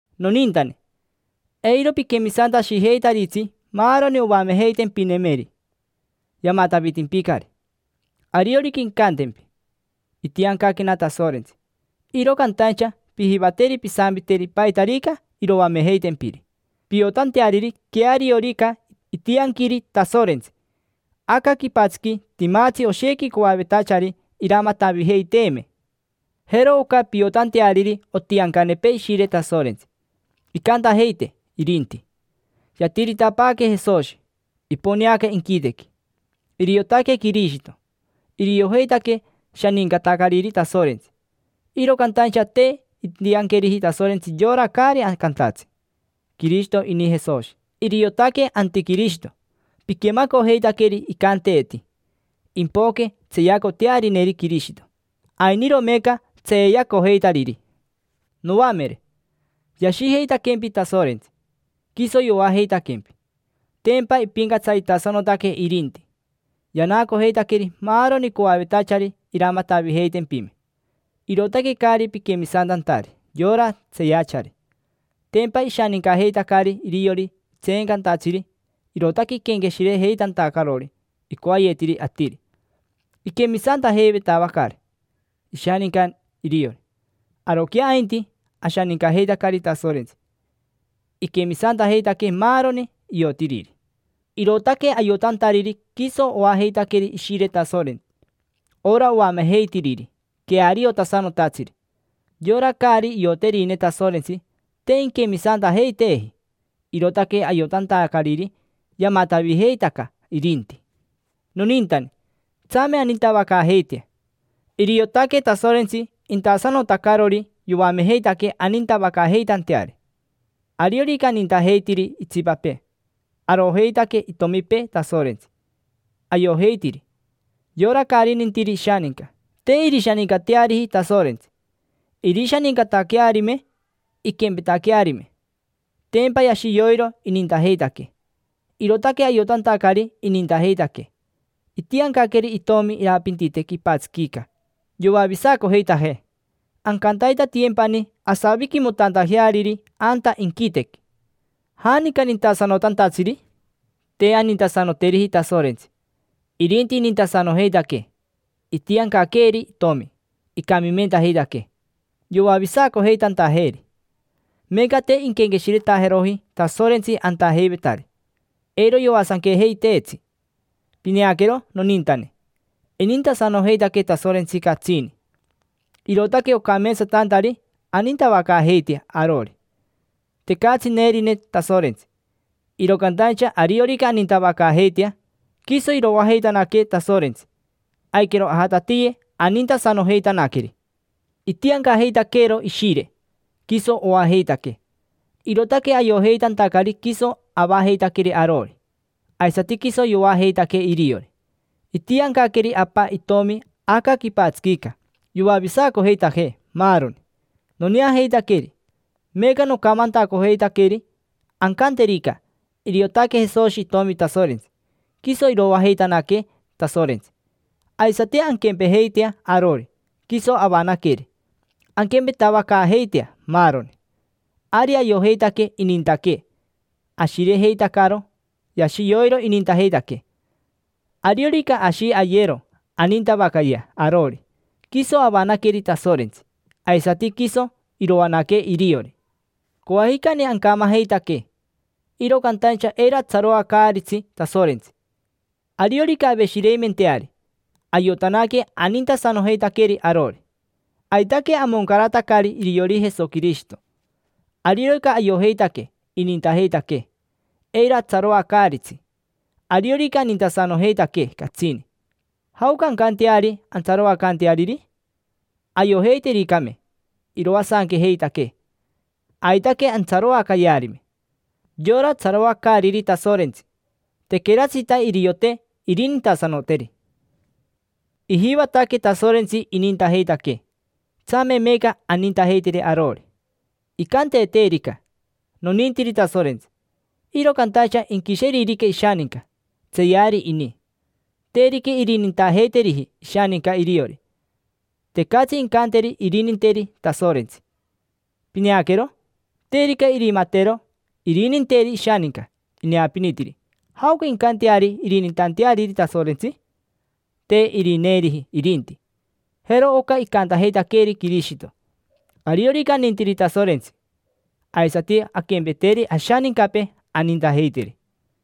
Nonintane, eiro piquemisantashijeitaritsi maaroni oamejeitempinemeri: yamatavitimpicari. Ariorica incantempi: “Itiancaquena Tasorentsi”, iro cantaincha pijivateri pisampiteri paitarica iroamejeitempiri, piotanteariri queariorica itianquiri Tasorentsi. Aca quipatsiqui timatsi oshequi coavetachari iramatavijeiteeme. Jero oca piotanteariri otiancanepee Ishire Tasorentsi: incantajeitee irinti: “Yatiritapaaque Jesoshi, iponeaca inquitequi. Iriotaque Quirishito”. Iriojeitaque shanincatacariri Tasorentsi. Iro cantaincha te intianqueriji Tasorentsi yora caari cantatsi: “Quirishito ini Jesoshi”. Iriotaque antiquirishito. Piquemacojeitaqueri icanteeti: “Impoque tseeyacotearineri Quirishito”. Ainiro meeca tseeyacojeitariri. Noamere, yashijeitaquempi Tasorentsi, quiso yoajeitaquempi. Tempa ipincatsaritasanotaque irinti, yanacojeitaqueri maaroni coavetachari iramatavijeitempime. Irootaque caari piquemisantantari yora tseeyachari. Tempa ishanincajeitacari iriori tseencantatsiri, irootaque iquenqueshirejeitantacarori icoayetiri atiri. Iquemisantajeitavaqueri ishaninca iriori. Aroquea ainti, ashanincajeitacari Tasorentsi, iquemisantajeitaquee maaroni iotiriri, irootaque ayotantariri quiso oajeitaqueri Ishire Tasorentsi: ora oamejeitiriri queariotasanotatsiri. Yora caari ioterine Tasorentsi, te inquemisantajeiteeji, irootaque ayotantacariri yamatavijeitaca irinti. Nonintane, tsame anintavacaajeitea. Iriotaque Tasorentsi intasanotacarori yoamejeitaquee anintavacaajeitanteari. Ariorica anintajeitiri itsipapee, arojeitaque itomipee Tasorentsi, ayojeitiri. Yora caari nintiri ishaninca, te irishanincateariji Tasorentsi: irishanincataquearime, inquempetaquearime, tempa yashi yoiro inintajeitaquee. Irootaque ayotantacari inintajeitaquee, itiancaqueri Itomi irapintite quipatsiquica yoavisacojeitajee, ancantaitatiyempani asaviquimotantajeariri anta inquitequi. ¿Janica nintasanotantatsiri? Te anintasanoteriji Tasorentsi, irinti inintasanojeitaquee. Itiancaqueeri Itomi, icamimentajeitaquee, yoavisacojeitantajeeri. Meeca te inquenqueshiretajeroji Tasorentsi antajeivetari, eiro yoasanquejeiteetsi. Pineaquero nonintane, inintasanojeitaquee Tasorentsi catsini. Irootaque ocameetsatantari anintavacaajeitea arori. Tecatsi neerine Tasorentsi, iro cantaincha ariorica anintavacaajeitea, quiso iroajeitanaquee Tasorentsi, aiquero ajatatiye anintasanojeitanaqueri. Itiancajeitaqueero Ishire, quiso oajeitaquee. Irootaque ayojeitantacari quiso avajeitaqueri arori, aisati quiso yoajeitaquee iriori. Itiancaqueri Apa Itomi aca quipatsiquica yoavisacojeitajee, maaroni. Noneajeitaqueri, meeca nocamantacojeitaqueri. Ancanterica: “Iriotaque Jesoshi Itomi Tasorentsi”, quiso iroajeitanaquee Tasorentsi. Aisati anquempejeitea arori, quiso avanaqueri: anquempetavacaajeitea maaroni. Ari ayojeitaque inintaquee, ashirejeitacaro. Yashi yoiro inintajeitaquee. Ariorica ashi ayero anintavacayea arori, quiso avanaqueri Tasorentsi, aisati quiso iroanaquee iriori. Coajicani ancamajeitaque, iro cantaincha eiro atsaroacaaritsi Tasorentsi. Ariorica aveshireimenteari, ayotanaque anintasanojeitaqueri arori, aitaque amoncaratacari iriori Jesoquirishito. Ariorica ayojeitaque inintajeitaquee, eiro atsaroacaaritsi. Ariorica inintasanojeitaquee catsini, ¿jaoca ancanteari antsaroacanteariri? Ayojeitericame iroasanquejeitaquee, aitaque antsaroacayearime. Yora tsaroacaariri Tasorentsi, tequeratsita iriote irinintasanoteri. Ijivataquee Tasorentsi inintajeitaquee, tsame meeca anintajeiteri arori. Incanteeterica: “Nonintiri Tasorentsi”, iro cantaincha inquisheririca ishaninca, tseeyari ini. Terica irinintajeiteriji ishaninca iriori, tecatsi incanteri irininteri Tasorentsi. Pineaquero, terica irimatero irininteri ishaninca ineapinitiri, ¿jaoca incanteari irinintanteariri Tasorentsi? Te irineeriji irinti. Jero oca icantajeitaqueeri Quirishito: “Ariorica anintiri Tasorentsi, aisati anquempeteri ashanincapee, anintajeiteri”.